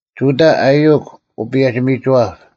ᒍᑕ ᐊᔪᐅᒄ ᐅᐸᔭᒋ-ᒥᒋᐛᑉ,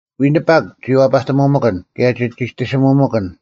ᐎᓂᐸᒄ ᒋ ᐛᐸᑎᒧᒥᑭᓐ, ᑭᔭ ᒋ ᒋᑎᓯᒧᒥᑭᓐ;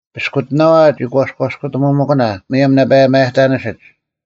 ᐱᔅᑯᑎᓇᐛ ᒋ ᒂᔎᔅᑯᑎᒧᒥᑭᓇ ᒧᔭᒻ ᓇᐸ ᒪᔭᑕᓂᓯᒡ,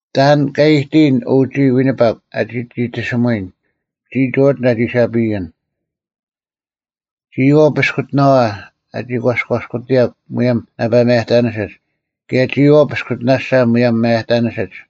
ᑕᓐ ᑲ ᐃᑎᔨᓐ, ᐅ ᒋᔾ ᐎᓂᐸᒄ, ᐊᒋ ᒋᑎᓯᒧᔨᓐ? ᒋᔾ ᒠᕐᑕᓐ ᐊᒋ ᐊᓴᐱᔨᓐ? ᒋᔨᐛᐤ ᐱᔅᑯᑎᓇᐛ, ᐊᒋ ᒂᔎᔅᑯᑎᔭᒄ ᒧᔭᒻ ᓇᐸ ᒪᔭᑕᓂᓯᒡ; ᑭᔭ ᒋᔨᐛᐤ ᐱᔅᑯᑎᓇᓴ ᒧᔭᒻ ᒪᔭᑕᓂᓯᒡ?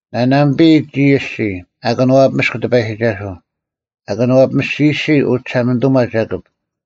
ᓂᓇᒥᐸᔨ, ᒋᔾ ᐊᔅᒋᔾ, ᐊ ᑭᓄᐛᐱᒥᔅᒃ ᑎᐸᔨᒋᒐᓱᐤ, ᐊ ᑭᓄᐛᐱᒥᔅᒋᔨᔅᒋ ᐅᒋᓴᒪᓂᑐᒪ ᒐᑭᑉ;